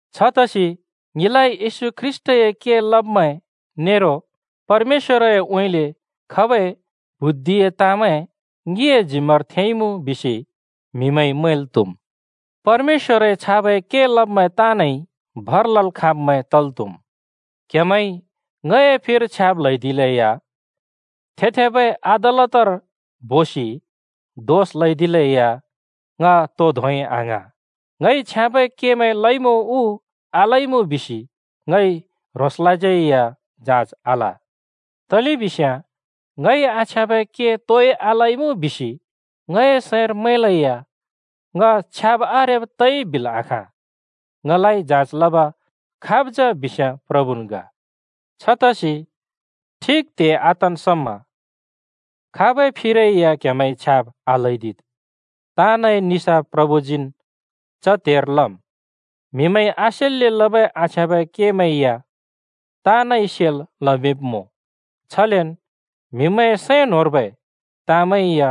छतसि ङिलाइ येशू ख्रीष्‍टए के लब्मैं नेरो परमेश्‍वरउँइँले खबै बुद्धिए ताँमैं ङिए जिम्‍मार थेंइमुँ बिसि म्हिमैंइ मैंल् त्‍हुम्। परमेश्‍वरए छाबै के लब्मैं ताँनइ भर लल् खाँब्मैं तल् त्हुम्। क्हेमैंइ ङए फिर छ्याब् ल्हैदिलेया, थे-थेबै अदालतर बोसि दोष ल्हैदिलेया, ङ तोइ धोंइ आङ्हाँ। ङइ छ्याँबै केमैं लइमुँ उ आलइमुँ बिसि ङइ ह्रोंसलाज्यै या जाँच आल। तलेबिस्याँ ङइ आछ्याँबै के तोइ आलइमुँ बिसि ङए सैंर मैंलेया ङ छ्याब् आरेब् तइ बिल् आखाँ। ङलाइ जाँच लब खाब् जा बिस्याँ प्रभुन् ग। छतसि ठिक त्हे आतन् समा खाबै फिरै या क्हेमैंइ छ्याब् आल्हैदिद्, ताँनए निसाफ प्रभुजीन् च त्हेर लम्। म्हिमैंइ आसेल्‍ले लबै आछ्याँबै केमैं या ताँनइ सेल् लमिंब्मुँ, छलेन म्‍हिमैंए सैं न्‍होंर्बै ताँमैं या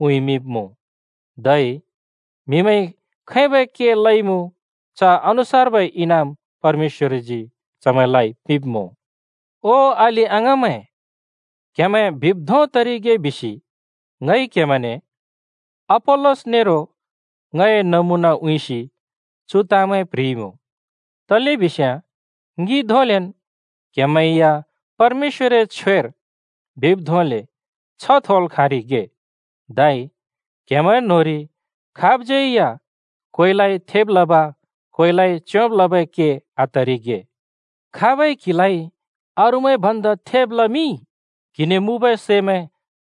उँइँमिंब्‍मुँ। धै म्हिमैंइ खैबै केमैं लइमुँ च अनुसार्बै इनाम परमेश्‍वरजी चमैंलाइ पिंब्‍मुँ। ओ अलि-अङाँमैं, क्हेमैं बिब् धों तरिगे बिसि ङइ क्हेमैंने अपोल्‍लस नेरो ङए नमुना उँइँसि चु ताँमैं प्ह्रिइमुँ। तलेबिस्याँ ङि धोंलेन् क्हेमैं या परमेश्‍वए छ्वेर बिब् धोंले छ्ह थोल् खाँरिगे, धै क्हेमैं न्होंरि खाबज्यै या कोइलाइ थेब् लब कोइलाइ च्योंब् लबै के आतरिगे। खाबइ क्हिलाइ अरूमैं भन्दा थेब् लमिंइ? क्‍हिने मुँबै सैमैं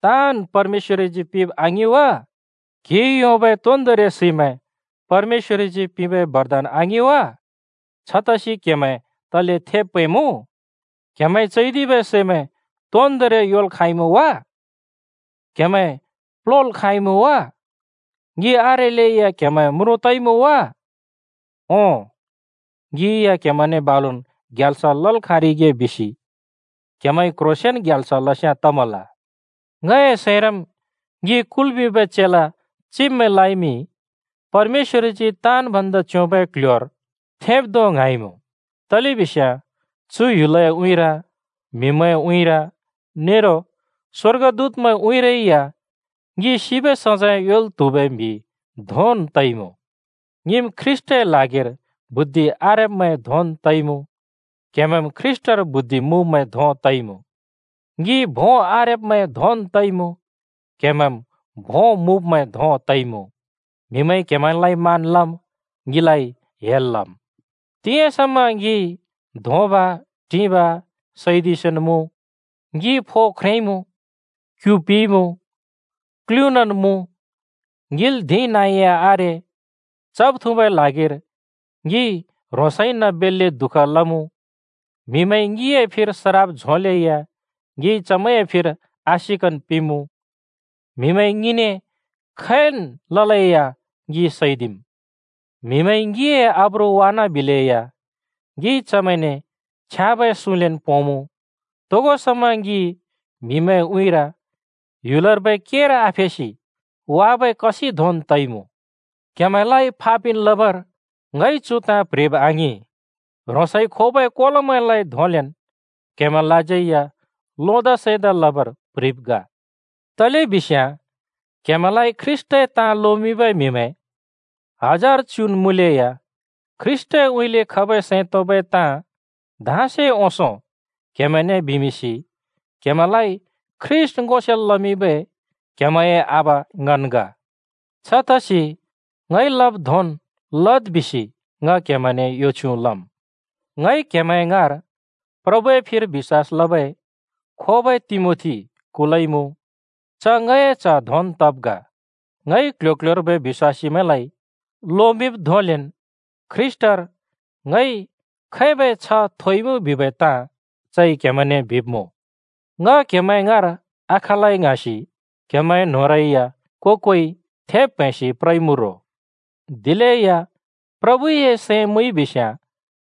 ताँन् परमेश्‍वरजी पिंब आङिं वा? क्‍हिइ योंबै तोन्दोंरि सैमैं परमेश्‍वरजी पिंबै बरदान आङिं वा? छतसि क्हेमैं तले थेब् प्हैंमुँ? क्‍हेमैंइ चैदिबै सैमैं तोन्दोंरि योंल् खाँइमुँ वा? क्‍हेमैं प्‍ल्‍होल् खाँइमुँ वा? ङि आरेल्‍लै या क्हेमैं म्रुँ तइमुँ वा? ओं, ङि या क्‍हेमैंने बालुन् ग्याल्स लल् खाँरिगे बिसि क्‍हेमैंइ क्‍ह्रोंसेंन ग्याल्स लस्याँ तमल! ङए सैंरम् ङि कुल्मिंबै चेला चिब्मैंलाइमि परमेश्‍वरजी ताँन् भन्दा च्‍योंबै क्‍ल्‍ह्‍योर थेंब् धों ङ्हाँइमुँ, तलेबिस्याँ चु ह्‍युलए उँइँर, म्हिमैंए उँइँर नेरो स्वर्गदूतमैंए उँइँरै या ङि सिबै सजैं योंल् त्हुबै म्हि धोंन् तइमुँ। ङिम् ख्रीष्‍टए ल्हागिर बुद्धि आरेब्मैं धोंन् तइमुँ, क्‍हेमैंम् ख्रीष्‍टर बुद्धि मुँब्मैं धों तइमुँ! ङि भों आरेब्मैं धोंन् तइमुँ, क्हेमैंम् भों मुँब्मैं धों तइमुँ! म्‍हिमैंइ क्‍हेमैंलाइ मान लम्, ङिलाइ हेल लम्। तिंयाँ समा ङिइ धोंब-टिंब सैदिसिन् मुँ, ङि फो ख्रेंइमुँ, क्यु पिइमुँ, क्‍लुनान् मुँ, ङिल धिं नाँ या आरे, चब-थुँबै ल्हागिर ङिइ ह्रोंसइन बेल्‍ले दुःख लमुँ। म्हिमैंइ ङिए फिर सराप झोंलेया ङिइ चमैंए फिर आशिकन् पिंमुँ। म्हिमैंइ ङिने खैन् ललेया ङि सैदिम्। म्‍हिमैंइ ङिए आब्रु वानाबिलेया ङिइ चमैंने छ्याँबै सुँलेन् पोंमु। तोगो समा ङि म्हिमैंए उँइँर ह्‍युलर्बै केर आफेसि वाबै कसिं धोंन् तइमुँ। क्‍हेमैंलाइ फाफिन् लबर ङइ चु ताँ प्ह्रिब् आङिं, ह्रोंसए खोबै कोलोमैंलाइ धोंलेन् क्हेमैंलाज्यै या लोदा सैंदा लबर प्ह्रिब् ग। तलेबिस्याँ क्हेमैंलाइ ख्रीष्‍टए ताँ लोमिंबै म्हिमैं हजार च्‍युन् मुँलेया ख्रीष्‍टउँइँले खबै सैं तोंबै ताँ धाँसे ओंसो क्हेमैंने बिमिंसि क्हेमैंलाइ ख्रीष्‍ट ङो सेल् लमिंबै क्हेमैंए आबा ङन् ग। छतसि ङइ लब् धोंन् लद् बिसि ङ क्हेमैंने यो छ्युँ लम्। ङइ क्हेमैं ङाँर प्रभुए फिर बिश्‍वास लबै खोबै तिमोथी कुलइमुँ। च ङए च्‍ह धोंन् तब् ग। ङइ क्ल्ह्‍यो-क्ल्ह्‍योर्बै बिश्‍वासीमैंलाइ लोमिंब् धोंलेन् ख्रीष्‍टर ङइ खैबै छ्ह थोइमुँ बिबै ताँ चइ क्‍हेमैंने बिब्‍मुँ। ङ क्हेमैं ङाँर आखलै ङ्हाँसि क्‍हेमैंए न्‍होंरै या को-कोइ थेब् प्हैंसि प्रइमुँ रो। दिलेया प्रभुए सैं मुइबिस्‍याँ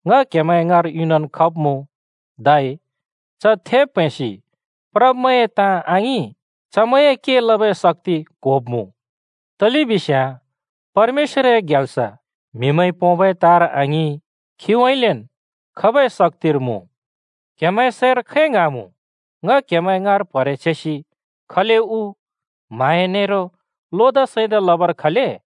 ङ क्‍हेमैं ङाँर युनन् खब्मुँ। धै च थेब् प्हैंसि प्रब्मैंए ताँ आङिं, चमैंए के लबै शक्‍ति क्होब्मुँ। तलेबिस्याँ परमेश्‍वरए ग्याल्स म्हिमैंइ पोंबै ताँर आङिं, खीउँइँलेन् खबै शक्‍तिर मुँ। क्‍हेमैंए सैंर खै ङ्हाँमुँ, ङ क्‍हेमैं ङाँर प्हरे छेसि खले उ? म्हाँया नेरो लोदा सैंदा लबर खले?